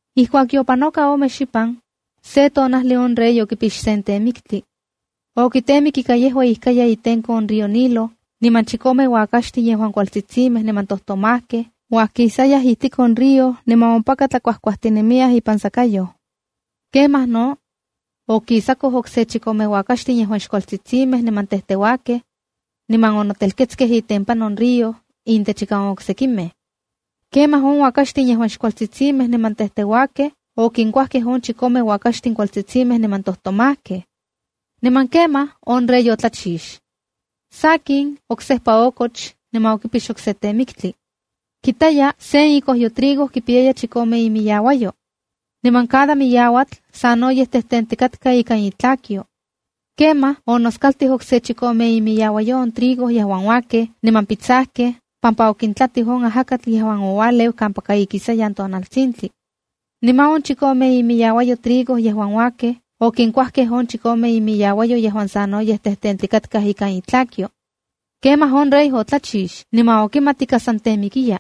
Ijkuak yopanoka ome xipan, se tonajli on rey okipix sen temiktli. Okitemik ika yejua ijkaya itenko on río Nilo, niman chikome uakaxtin yejuan kualtsitsimej niman tomajkej uajkisayaj ijtik on río niman ompaka tlakuajkuajtinemiyaj ipan sakayoj. Kemaj no okisakoj okse chikome uakaxtin yejuan xkualtsitsimej niman tejteuakej. Niman onotelketskej itempan on río, intechika on oksekimej. Kemaj on uakaxtin yejuan xkualtsitsimej niman tejteuakej, okinkuajkej on chikome uakaxtin kualtsitsimej niman tojtomajkej. Niman kemaj on rey otlachix. Sakin, oksejpa okoch niman okipix okse temiktli. Kitaya sen ikojyo trigo kipiyaya chikome imiyauayo. Niman cada miyauatl sanoyej tejtentikatka ikan itlakyo. Kemaj onoskaltij okse chikome imiyauayo on trigo yejuan uakej niman pitsajkej pampa okintlatij on ajakatl yejuan oualeu kampaka ikisayan tonaltsintli. Niman on chikome imiyauayo trigo yejuan uakej okinkuajkej on chikome imiyauayo yejuan sanoyej tejtentikatkaj ikan itlakyo. Kemaj on rey otlachix niman okimat ika san temikiya.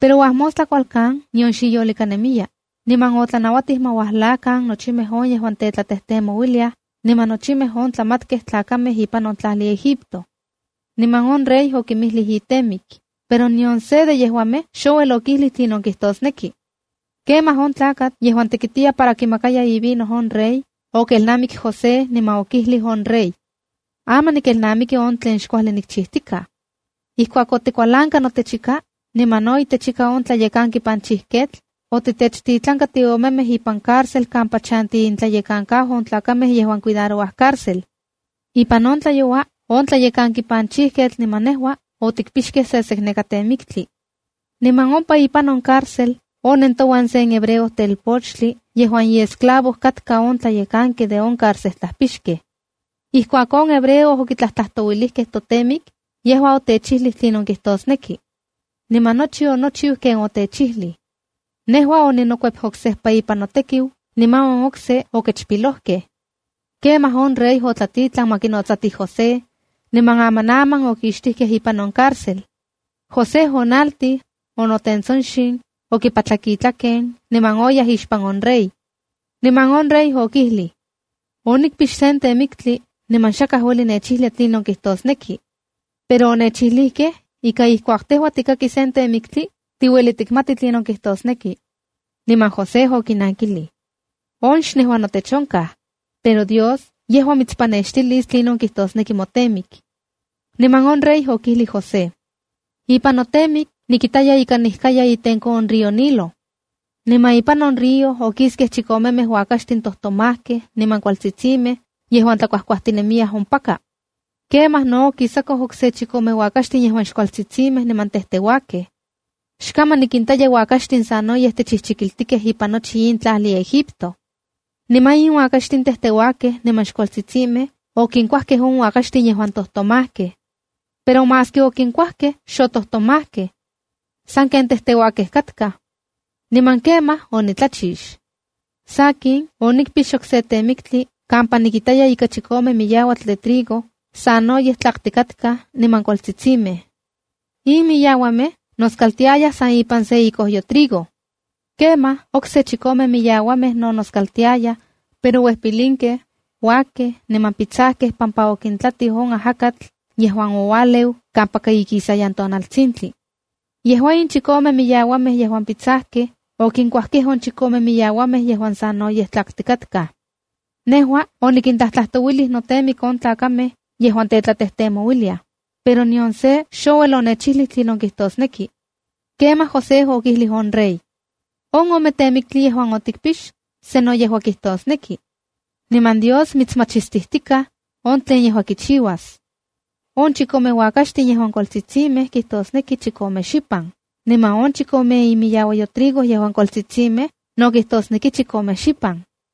Pero uajmostla kualkan nion xiyolika nemiya, niman otlanauatij ma uajlakan nochimej on yejuan tetlatejtemouiliaj niman nochimej on tlamatkej tlakamej ipan on tlajli Egipto. Niman on rey okinmijlij itemik, pero nion se de yejuamej xouel okijlij tlinon kijtosneki. Kemaj on tlakatl yejuan tekitiya itekiu para kimaka ivino on rey, okelnamik José niman okijlij on rey: —Aman nikelnamiki on tlen xkuajli nikchijtikaj. Ijkuak otikualanka notechika, niman no itechika on tlayekanki panchijketl otitechtitlanka tiomemej ipan cárcej kampa chanti intlayekankau on tlakamej yejuan cuidarouaj on cárcel. Ipan se tlayoua on tlayekanki panchijketl niman nejua otikpixkej sesekneka temiktli. Niman ompa ipan on cárcel onen touan sen hebreo telpochtli yejuan iesclavo katka on tlayekanki de on carcejtlajpixkej. Ijkuak on hebreo otiktlajtlajtouilijkej totemik, yejua otechijlij tlinon kijtosneki. Niman nochi onochiu ken otechijlij. Nejua oninokuep oksejpa ipan notekiu niman on okse okechpilojkej. Kemaj on rey otlatitlan ma kinotsatij José, niman amanaman okixtijkej ipan on cárcel. José onaltij, onotentsonxin, okipatlak itlaken, niman oyaj ixpan on rey. Niman on rey okijlij: —Onikpix sen temiktli niman xakaj ueli nechijlia tlinon kijtosneki. Pero onechijlijkej ika ijkuak tejua tikaki sen temiktli, tiueli tikmati tlinon kijtosneki. Niman José okinankilij: —On xnejua notech onkaj; pero Dios yejua mitspanextilis tlinon kijtosneki motemik. Niman on rey okijlij José: —Ipan notemik nikitaya ika nijkatikatka itenko on río Nilo. Niman ipan on río okiskej chikomemej uakaxtij tojtomajkej niman kualtsitsimej yejuan tlakuajkuajtinemiyaj ompaka. Kemaj no okisakoj okse chikome uakaxtin yejuan xkualtsitsimej niman tejteuakej. ¡Xkaman nikintaya uakaxtin sanoyej techijchikiltikej ipan nochi in tlajli Egipto! Niman in uakaxtin tejteuakej niman xkualtsitsimej okinkuajkej on uakaxtin yejuan tojtomajkej. Pero maski okinkuajkej xotomajkej. Sanken tejteuakej katkaj. Niman kemaj onitlachix. Sakin, onikpix okse temiktli kampa nikitaya ika chikome miyauatl de trigo, sanoyej tlaktikatkaj niman kualtsitsimej. In miyauamej noskaltiayaj san ipan se ikojyo trigo. Kemaj okse chikome miyauamej no noskaltiayaj pero uej pilinkej, uakkej, niman pitsajkej pampa okintlatij on ajakatl yejuan oualeu kampaka ikisayan tonaltsintli. Yejuan in chikome miyauamej yejuan pitsajkej, okinkuajkej on chikome miyauamej yejuan sanoyej tlaktikatkaj. Nejua onikintlajtlajtouilij notemik on tlakamej yejuan tetlatejtemouiliaj, pero nion se xouel onechijlij tlinon kijtosneki. Kemaj José okijlij on rey: —On ome temiktli yejuan otikpix, sano yejua kijtosneki, niman Dios mitsmachistijtikaj on tlen yejua kichiuas. On chikome uakaxtin yejuan kualtsitsimej kijtosneki chikome xipan, niman on chikome imiyauayo trigo yejuan kualtsitsimej no kijtosneki chikome xipan.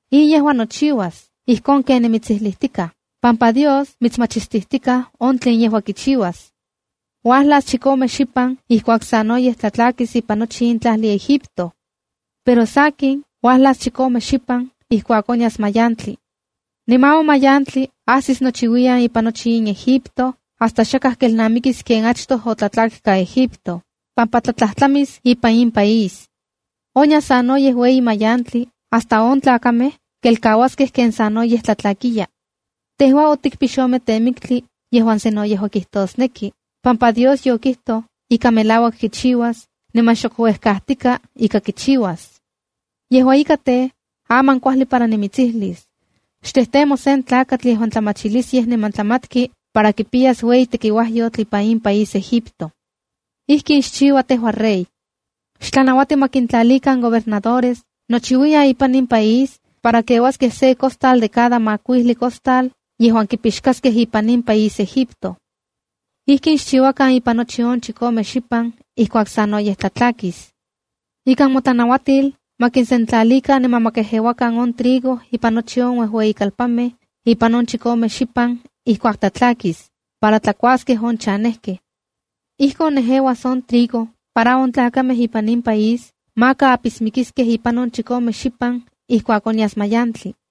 In yejua nochiuas ijkon ken nimitsijlijtikaj pampa Dios mitsmachistijtikaj on tlen yejua kichiuas. Uajlas chikome xipan ijkuak sanoyej tlatlakis ipan nochi in país Egipto. Pero sakin, uajlas chikome xipan ijkuak onyas mayantli. Niman on mayantli ajsis nochiuiyan ipan nochi in país Egipto hasta xakaj kelnamikis ken achtoj otlatlakka Egipto, pampa tlatlajtlamis ipan in país. Onyas sanoyej ueyi mayantli, hasta on tlakamej kelkauaskej ken sanoyej tlatlakkiya. Tejua otikpix ome temiktli yejuan sano yejua kitosneki, pampa Dios yokijtoj ika melauak kichiuas, niman xok uejkatika ika kichiuas. ’Yejua ika tej, aman kuajli para nimitsijlis: “Xtejtemo sen tlakatl yejuan tlamachilisyej niman tlamatki para kipiyas ueyi tekiuajyotl ipan in país Egipto. Ijkin xchiua tejua rey: xtlanauati ma kintlalikan gobernadores nochiuiyan ipan nochi in país para keuaskej se costal de cada makuijli costal yejuan kipixkaskej ipan in país Egipto. Ijkin xchiuakan ipan nochi on chikome xipan ijkuak sanoyej tlatlakis. Ikan motlanauatil ma kisentlalikan niman ma kejeuakan on trigo ipan nochi on uejueyikalpanmej ipan on chikome xipan ijkuak tlatlakis, para tlakuaskej on chanejkej. Ijkon nejeuas on trigo para on tlakamej ipan in país maka apismikiskej ipan on chikome xipan ijkuak onyas mayantli.”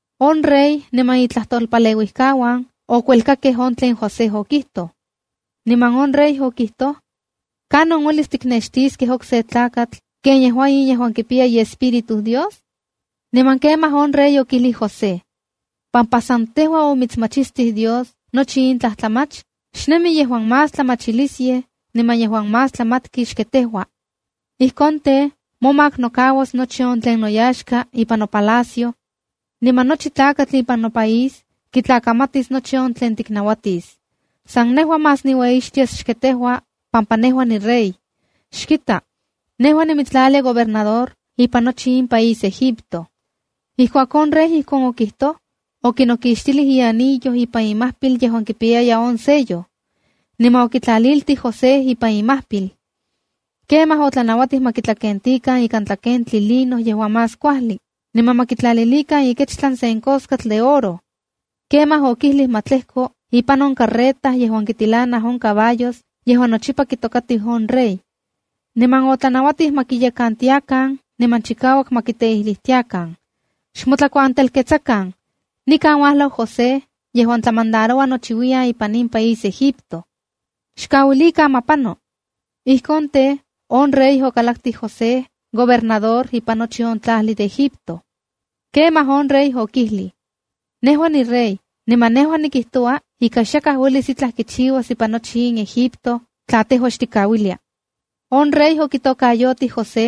On rey niman itlajtolpaleuijkauan okuelkakej on tlen José okijtoj. Niman on rey okijtoj: —¿Kanon uelis tiknextiskej okse tlakatl ken yejua in yejuan kipiya iespíritu Dios? Niman kemaj on rey okijlij José: —Pampa san tejua omitsmachistij Dios nochi in tlajtlamach, xnemi yejuan más tlamachilisyej, niman yejuan más kimati xken tejua. Ijkon tej, momak nokauas nochi on tlen noyaxka nikan ipan nopalacio. Niman nochi tlakatl ipan nopaís kitlakamatis nochi tlen tiknauatis. San nejua más niueyixtias xken tejua pampa nejua nirey. Xkita, nejua nimitstlalia gobernador ipan nochi in país Egipto. Ijkuak on rey ijkon okijtoj, okinokixtilij ianillo ipan imajpil yejuan kipiyaya on sello, niman okitlaliltij José ipan imajpil. Kemaj otlanauatij ma kitlakentikan ika tlakentli lino yejuan más kuajli niman ma kitlalilikan ikechtlan sen koskatl de oro. Kemaj okijlij ma tlejko ipan on carreta yejuan kitilanaj on caballos yejuan nochipa kitokatiu on rey. Niman otlanauatij ma kiyekantiakan niman chikauak ma kiteijlitiakan: “¡Xmotlakuantelketsakan! ¡Nikan uajlau José yejuan tlamandaroua nochiuiyan ipan in país Egipto! ¡Xkauilikan ma pano!” Ijkon tej, on rey okalaktij José, gobernador ipan nochi on tlajli de Egipto. Kemaj on rey okijlij: —Nejua nirey, niman nejua nikijtoua ika xakaj uelis itlaj kichiuas ipan nochi in Egipto tla tejua xtikauilia. On rey okitokayotij José,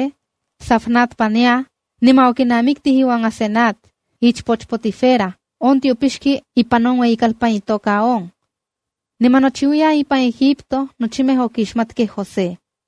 Zafnat-panea, niman okinamiktij iuan Asenat, ichpoch Potifera on tiopixki ipan on ueyikalpan itoka On. Niman nochiuiyan ipan Egipto nochimej okixmatkej José.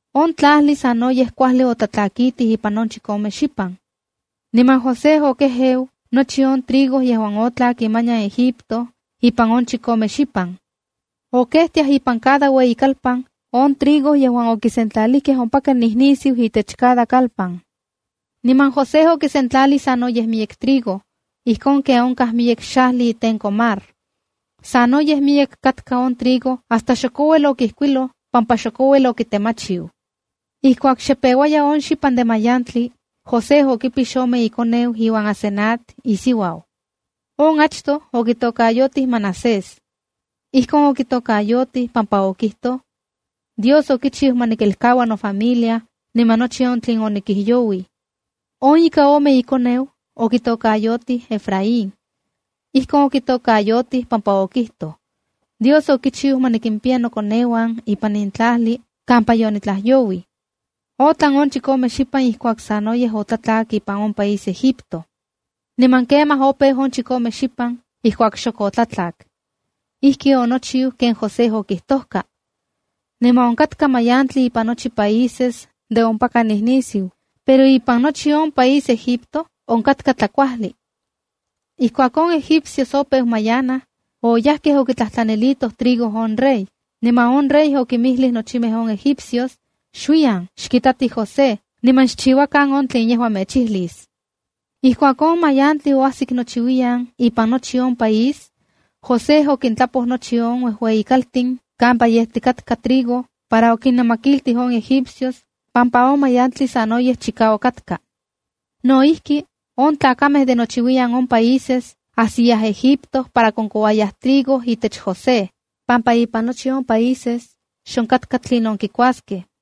On tlajli sanoyej kuajli otlatlakitij ipan on chikome xipan. Niman José okejeu nochi on trigo yejuan otlak imanian Egipto ipan on chikome xipan. Okejtiajkej ipan cada ueyikalpan on trigo yejuan okisentlalijkej ompaka nijnisiu itech cada kalpan. Niman José okisentlalij sanoyej miyek trigo, ijkon ken onkaj miyek xajli itenko mar. Sanoyej miyek katka on trigo hasta xok ouel okijkuiloj pampa xok ouel okitemachiu. Ijkuak xe peuaya on xipan de mayantli, José okipix ome ikoneu iuan Asenat, isiuau. On achtoj okitokayotij Manasésa. Ijkon okitokayotij pampa okijtoj: “Dios okichiu ma nikelkaua nofamilia niman nochi on tlen onikijyouij.” On ika ome ikoneu okitokayotij Efraínb. Ijkon okitokayotij pampa okijtoj: “Dios okichiu ma nikimpiya nokoneuan ipan in tlajli kampa yonitlajyouij.” Otlan on chikome xipan ijkuak sanoyej otlatlak ipan on país Egipto, niman kemaj opeu on chikome xipan ijkuak xok otlatlak. Ijki onochiu ken José okijtojka. Niman onkatka mayantli ipan nochi países de ompaka nijnisiu, pero ipan nochi on país Egipto onkatka tlakuajli. Ijkuak on egipcios opeu mayanaj, oyajkej okitlajtlanilitoj trigo on rey, niman on rey okinmijlij nochimej on egipcios: “Xuiyan xkitatij José niman xchiuakan on tlen yejua mechijlis.” Ijkuak on mayantli oajsik nochiuiyan ipan nochi on país, José okintlapoj nochi on uejueyi kaltin kampa yejtikatka trigo para okinnamakiltij on egipcios pampa on mayantli sanoyej chikauak katka. No ijki, on tlakamej de nochiuiyan on países ajsiyaj Egipto para konkouayaj trigo itech José, pampa ipan nochi on países, xonkatka tlinon kikuaskej.